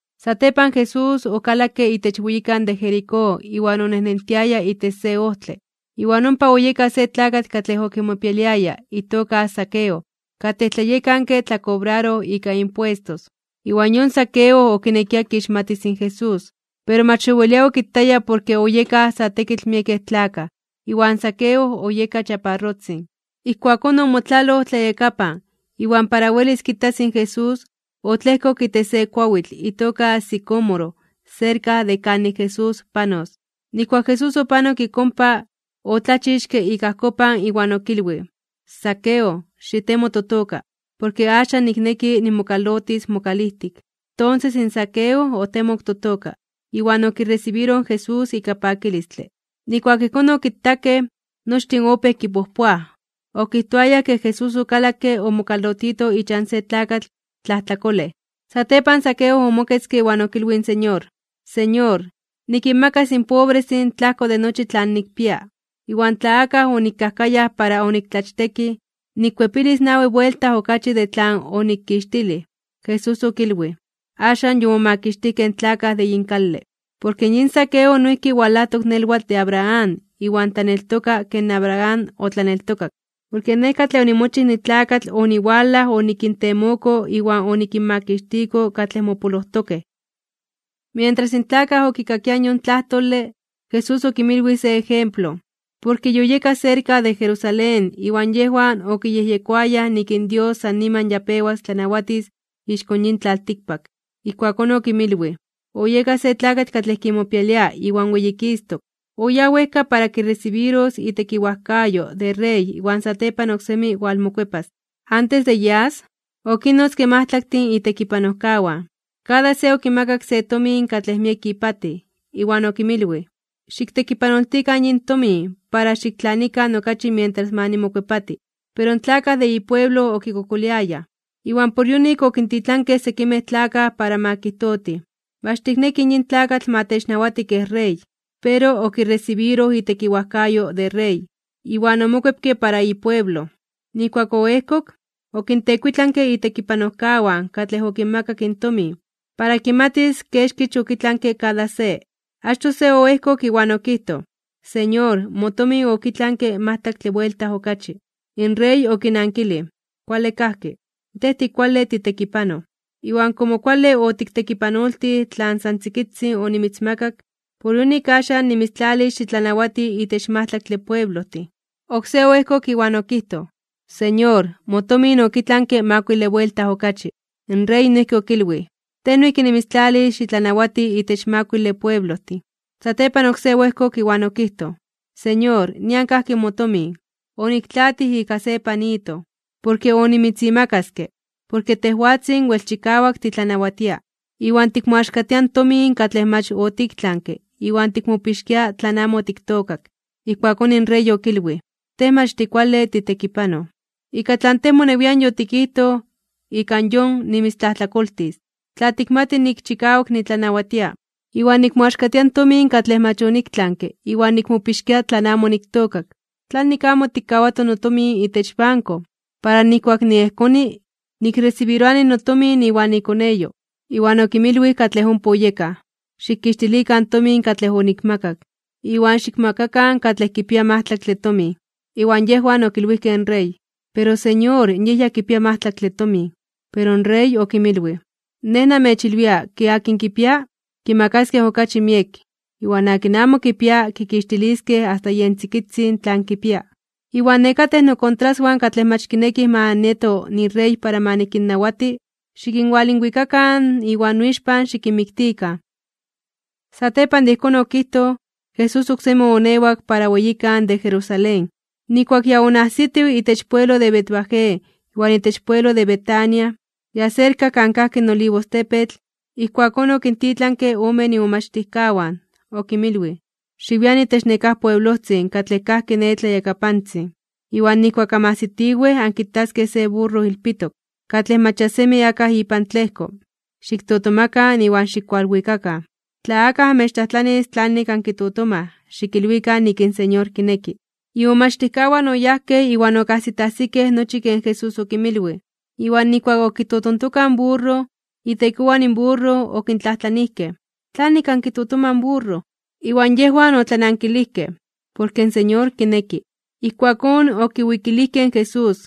Satepan Jesús okalakke itech weyikan de Jericó iwan onejnentiaya itech se ojtle, iwan ompa oyeka se tlakatl katlej okimopialiaya itoka Zaqueo, katlej tlayekanke tlakobraroj ika impuestos, iwan yon Zaqueo okinekia kixmatis in Jesús. Pero mach owelia okitaya porke oyekaj sa tekitl miekej tlakaj iwan Zaqueo oyeka chaparrotzin. Ijkuakón omotlaloj tlayakapan, iwan para welis kitas in Jesús, otlejkok itech se kuawitl itoka sicómoro serka de kanik Jesús panos. Nijkuak Jesús opanok ik ompa, otlachixke ik ajkopan iwan okilwij: ―Zaqueo, xitemo totoka, porke axan nikneki nimokalotis mokalijtik. Tonses in Zaqueo otemok totoka, iwan okiresibiroj in Jesús ika pakilistle. Nijkuak ijkón okitakej, nochtin opéj kipojpoaj, okijtoayaj ke Jesús okalakke omokalotito ichan se tlakatl tlajtlakolej. Satepan Zaqueo omoketzke iwan okilwij in Señor: ―Señor, nikinmakas in pobrestin tlajko de nochi tlan nikpia. Iwan tla akaj onikajkayaj para oniktlachtekij, nikkuepilis nawi buelta okachi de tlan onikixtilij. Jesús okilwij: ―Axan yomomakixtijkej in tlakaj de yin kale. Porke yin Zaqueo noijki walajtok nelwatl de Abraham iwan tlaneltoka ken Abraham otlaneltokak. Porke Nej katlej onimochij nitlakatl oniwalaj onikintemoko iwan onikinmakixtiko katlej mopolojtokej. Mientras in tlakaj okikakiaj yon tlajtole, Jesús okinmilwij se ejemplo, porke yoyeka serka de Jerusalén iwan yejwan okiyejyekoayaj nik in Dios san niman ya pewas tlanawatis ixko yin tlaltikpak. Ijkuakón okinmilwij: ―Oyeka se tlakatl katlej kimopialia iwan weyikistok (weyititok), oyáj wejka para kiresibiros itekiwajkayo de rey iwan satepan oksemi walmokuepas. Antes de yas, okinnotzke majtlaktin itekipanojkawan, kada se okimakak se tomin katlej miek ipatij, iwan okinmilwij: “Xiktekipanoltikan yin tomin para xiktlanikan okachi mientras ma nimokuepati.” Pero in tlakaj de ipueblo okikokoliayaj, iwan por yonik okintitlankej sekimej tlakaj para ma kijtotij: “Mach tiknekij yin tlakatl ma technawati kej rey.” Pero okiresibiroj itekiwajkayo de rey, iwan omokuepke para ipueblo. Nijkuak oejkok, okintekuitlanke itekipanojkawan katlej okinmakak in tomin, para kimatis kexkich okitlanke kada se. Achtoj se oejkok iwan okijtoj: “Señor, motomin okitlanke majtlaktle buelta okachi.” In rey okinankilij: “Kuale kajki. Tej tikuale titekipanoj. Iwan komo kuale otiktekipanoltij tlan san tzikitzin onimitzmakak, por yonik axan nimitztlalis xitlanawati itech majtlaktle pueblojtin.” Oksé oejkok iwan okijtoj: “Señor, motomin okitlanke makuile buelta okachi.” In rey noijki okilwij: “Tej noijki nimitztlalis xitlanawati itech makuile pueblojtin.” Satepan oksé oejkok iwan okijtoj: “Señor, nian kajki motomin. Oniktlaatij ika se panito. Porke onimitzimakaske, porke tejwatzin wel chikawak titlanawatia, iwan tikmoaxkatia tomin katlej mach otiktlanke iwan tikmopixkia tlan amo otiktookak.” Ijkuakón in rey okilwij: “Tej mach tikuale titekipanoj, ika tlan tej monewian yotikijtoj ika yon nimitztlajtlakoltis. Tla tikmati nik chikawak nitlanawatia, iwan nikmoaxkatia in tomin katlej mach oniktlanke iwan nikmopixkia tlan amo oniktookak, ¿tlanik amo otikkawato notomin itech banko, para nijkuak niejkoni, nikresibiroani notomin iwan ikoneyo?” Iwan okinmilwij katlej ompa oyekaj: “Xikixtilikan in tomin katlej onikmakak, iwan xikmakakan katlej kipia majtlaktle tomin.” Iwan yejwan okilwijkej in rey: “Pero Señor, yej ya kipia majtlaktle tomin.” Pero in rey okinmilwij: “Nej namechilwia, ke akin kipia, kimakaskej okachi miek. Iwan akin amo kipia, kikixtiliskej asta yen tzikitzin tlan kipia. Iwan nekatej nokontraswan katlej mach kinekij ma nieto nirey para ma nikinnawati, xikinwalinwikakan iwan noixpan xikinmiktikan.” Satepan de ijkón okijtoj, Jesús oksemi oonewak para weyikan de Jerusalén. Nijkuak ya onajsitiw itech pueblo de Betfagé iwan itech pueblo de Betania, ya serka kan kajki in Olivostepetl, ijkuakón okintitlanke ome imomachtijkawan, okinmilwij: ―Xiwian itech nekáj pueblojtzin katlej kajki ne tlayakapantzin, iwan nijkuak anmajsitiwej ankitaskej se burro ilpitok, katlej mach ya semi akaj ipan tlejko. Xiktotomakan iwan xikualwikakan. Tla akaj amechtlajtlanis tlanik ankitotomaj, xikilwikan nik in Señor kineki. Imomachtijkawan oyajkej, iwan okajsitajsikej nochi ken Jesús okinmilwij. Iwan nijkuak okitotontokaj in burro, itekowan in burro okintlajtlanijkej: ―¿Tlanik ankitotomaj in burro? Iwan yejwan otlanankilijkej: ―Porke in Señor kineki. Ijkuakón okiwikilijkej in Jesús,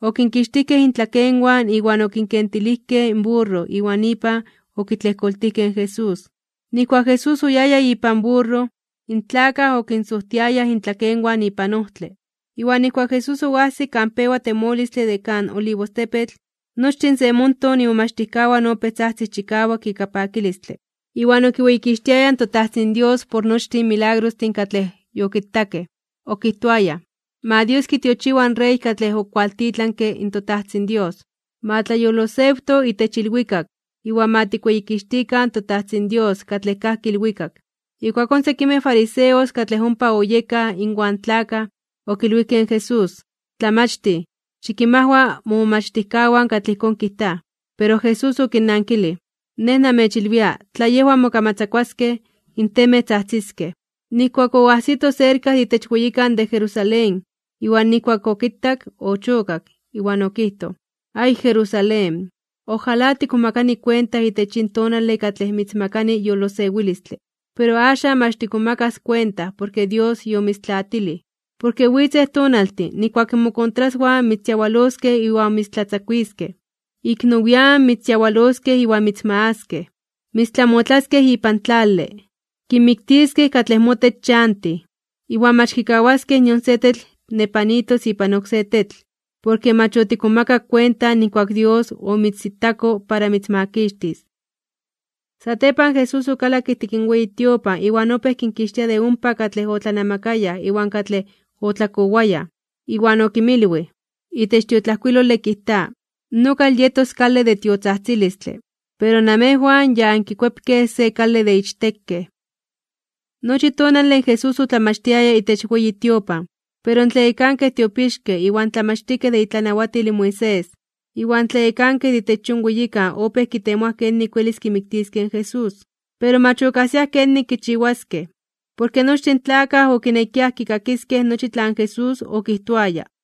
okinkixtijkej intlakenwan iwan okinkentilijkej in burro iwan ipan okitlejkoltijkej in Jesús. Nijkuak Jesús oyaya ipan burro, in tlakaj okinsojtiayaj intlakenwan ipan ojtle. Iwan nijkuak Jesús oajsik kan pewa temolistle de kan Olivostepetl, nochtin se monton imomachtijkawan opéj tzajtzij chikawak ika pakilistle iwan okiweyikixtiayaj in toTajtzin Dios por nochtin in milagrostin katlej yokitakej. Okijtoayaj: ―¡Ma Dios kitiochiwa in Rey katlej okualtitlanke in toTajtzin Dios! ¡Ma tlayolosewto itech ilwikak, iwan ma tikweyikixtikan toTajtzin Dios katlej kajki ilwikak! Ijkuakón sekimej fariseos katlej ompa oyekaj inwan in tlakaj, okilwijkej in Jesús: ―Tlamachtij, xikinmajwa momomachtijkawan katlej ijkón kijtaj. Pero Jesús okinnankilij: ―Nej namechilwia, tla yejwan mokamatzakuaskej, in temej tzajtziskej. Nijkuak oajsito serka de itech weyikan de Jerusalén, iwan nijkuak okitak, ochokak, iwan okijtoj: ―¡Ay, Jerusalén! ¡Ojalá tikmomakani kuenta itech yin tonale katlej mitzmakani yolosewilistle! Pero axan mach tikmomakas kuenta porke Dios yomitztlaatilij. Porke witzej tonaltin, nijkuak mokontraswan mitzyawaloskej iwan mitztlatzakuiskej. Ik nowian (nian nepa) mitzyawaloskej iwan mitzmagaskej. Mitztlamotlaskej ipan tlale. Kinmiktiskej katlej motech chantij, iwan mach kikawaskej nion se tetl nepanitos ipan oksé tetl. Porke mach otikmomakak kuenta nijkuak Dios omitzitako para mitzmakixtis. Satepan Jesús okalakke ijtik in weyi tiopan iwan opéj kinkixtia de ompa katlej otlanamakayaj iwan katlej otlakowayaj, iwan okinmilwij: ―Itech tiotlajkuilole kijta: “Nokal yetos kale de tiotzajtzilistle”. Pero namejwan ya ankikuepkej se kale de ichtekej. Nochi tonale Jesús otlamachtiaya itech weyi tiopan. Pero in tlayekankej tiopixkej iwan tlamachtijkej de itlanawatil in Moisés, iwan in tlayekankej de itech yon weyikan opéj kitemoaj kenik welis kimiktiskej. Pero mach okajsiaj kenik kichiwaskej, porke nochtin in tlakaj okinekiaj kikakiskej nochi tlan Jesús okijtoaya.